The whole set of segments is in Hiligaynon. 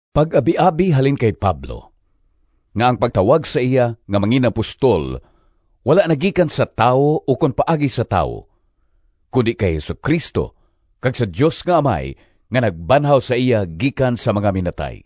Pag-abiabi halin kay Pablo, nga ang pagtawag sa iya nga mangin-apostol wala nagikan sa tawo ukon paagi sa tawo, kundi kay Jesu-Cristo kag sa Dios nga Amay, nga nagbanhaw sa iya gikan sa mga minatay.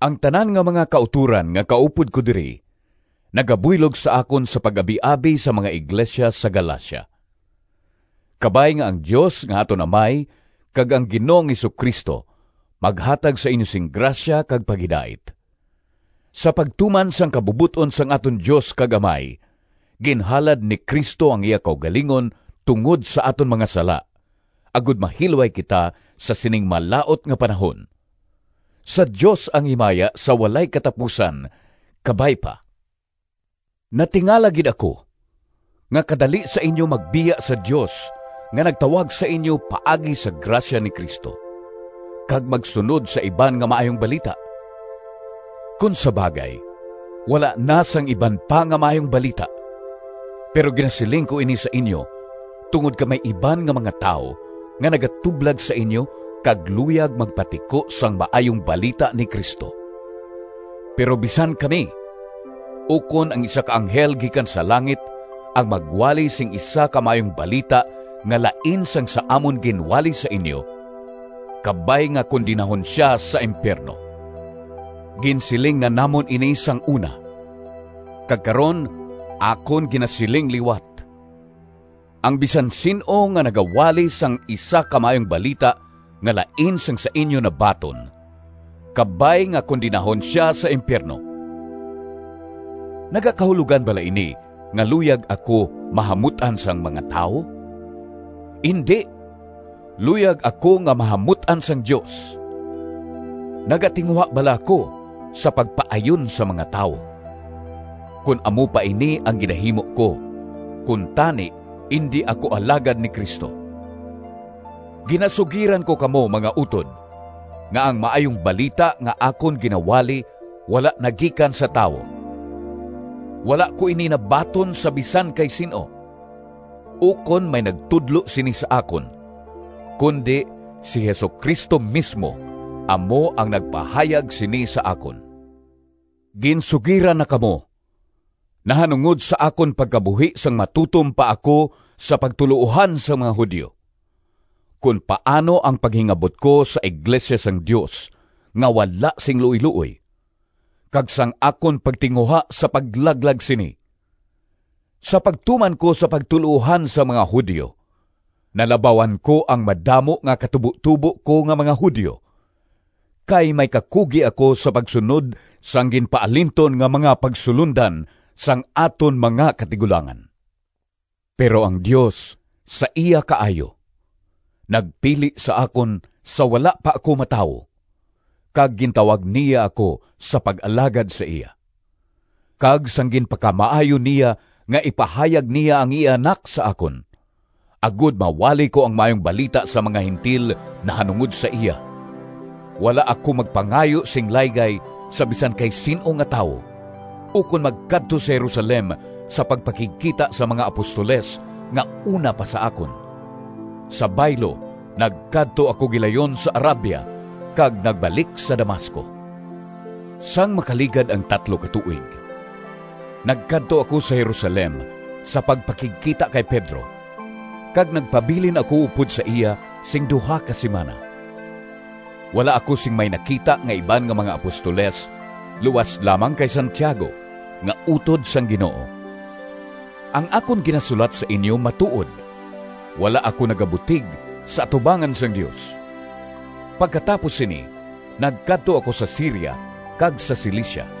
Ang tanan nga mga kautoran nga kaupod ko diri nagabuylog sa akon sa pag-abiabi sa mga iglesia sa Galacia. Kabay nga ang Dios nga aton Amay kag ang Ginoong Jesu-Cristo maghatag sa inyo sing grasya kag paghidait. Sa pagtuman sang kabubot-on sang aton Dios kag Amay, ginhalad ni Cristo ang iya kaugalingon tungod sa aton mga sala, agod mahilway kita sa sining malaut nga panahon. Sa Dios ang himaya sa walay katapusan! Kabay pa. Natingala gid ako nga kadali sa inyo magbiya sa Dios nga nagtawag sa inyo paagi sa grasya ni Cristo, kag magsunod sa iban nga maayong balita. Kon sa bagay, wala na sing “iban pa nga maayong balita,” pero ginasiling ko ini sa inyo tungod kay may iban nga mga tawo nga nagatublag sa inyo kag luyag magpatiko sang Maayong Balita ni Cristo. Pero bisan kami, ukon ang isa ka anghel gikan sa langit, ang magwali sing isa ka maayong balita nga lain sang sa amon ginwali sa inyo, kabay nga kondenahon sia sa impiyerno! Ginsiling na namon ini sang una, kag karon akon ginasiling liwat: ang bisan sin-o nga nagawali sang isa ka maayong balita nga lain sang sa inyo nabaton, kabay nga kondenahon sia sa impiyerno! Nagakahulogan bala ini nga luyag ako mahamut-an sang mga tawo? Indi! Luyag ako nga mahamut-an sang Dios! Nagatinguha bala ako sa pagpaayon sa mga tawo? Kon amo pa ini ang ginahimo ko, kuntani indi ako alagad ni Cristo. Ginasugiran ko kamo, mga utod, nga ang Maayong Balita nga akon ginawali wala nagikan sa tawo. Wala ko ini nabaton sa bisan kay sin-o, ukon may nagtudlo sini sa akon, kundi si Jesu-Cristo mismo amo ang nagpahayag sini sa akon. Ginsugiran na kamo nahanungod sa akon pagkabuhi sang matutom pa ako sa pagtuloohan sang mga Judio, kon paano ang paghingabot ko sa iglesia sang Dios nga wala sing luoyluoy, kag sang akon pagtinguha sa paglaglag sini. Sa pagtuman ko sa pagtuloohan sang mga Judio nalabawan ko ang madamo nga katubotubo ko nga mga Judio, kay may kakugi ako sa pagsunod sang ginpaalinton nga mga pagsulondan sang aton mga katigulangan. Pero ang Dios, sa iya kaayo, nagpili sa akon sa wala pa ako matawo, kag gintawag niya ako sa pag-alagad sa iya. Kag sang ginpakamaayo niya nga ipahayag niya ang iya Anak sa akon, agod mawali ko ang Maayong Balita sa mga Gentil nahanungod sa iya, wala ako magpangayo sing laygay sa bisan kay sin-o nga tawo, ukon magkadto sa Jerusalem sa pagpakigkita sa mga apostoles nga una pa sa akon. Sa baylo, nagkadto ako gilayon sa Arabia, kag nagbalik sa Damasco. Sang makaligad ang tatlo ka tuig, nagkadto ako sa Jerusalem sa pagpakigkita kay Pedro, kag nagpabilin ako upod sa iya sing duha ka simana. Wala ako sing may nakita nga iban nga mga apostoles luas lamang kay Santiago, nga utod sang Ginoo. Ang akon ginasulat sa inyo matuod. Wala ako nagabutig sa atubangan sang Dios! Pagkatapos sini nagkadto ako sa Siria kag sa Cilicia.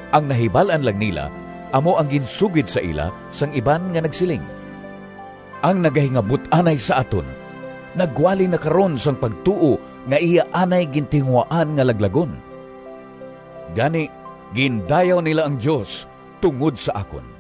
Ang nahibal-an lang nila amo ang ginsugid sa ila sang iban nga nagsiling, “Ang nagahingabot anay sa aton nagwali na karon sang pagtuo nga iya anay gintinguhaan nga laglagon!” Gani, gindayaw nila ang Dios tungod sa akon.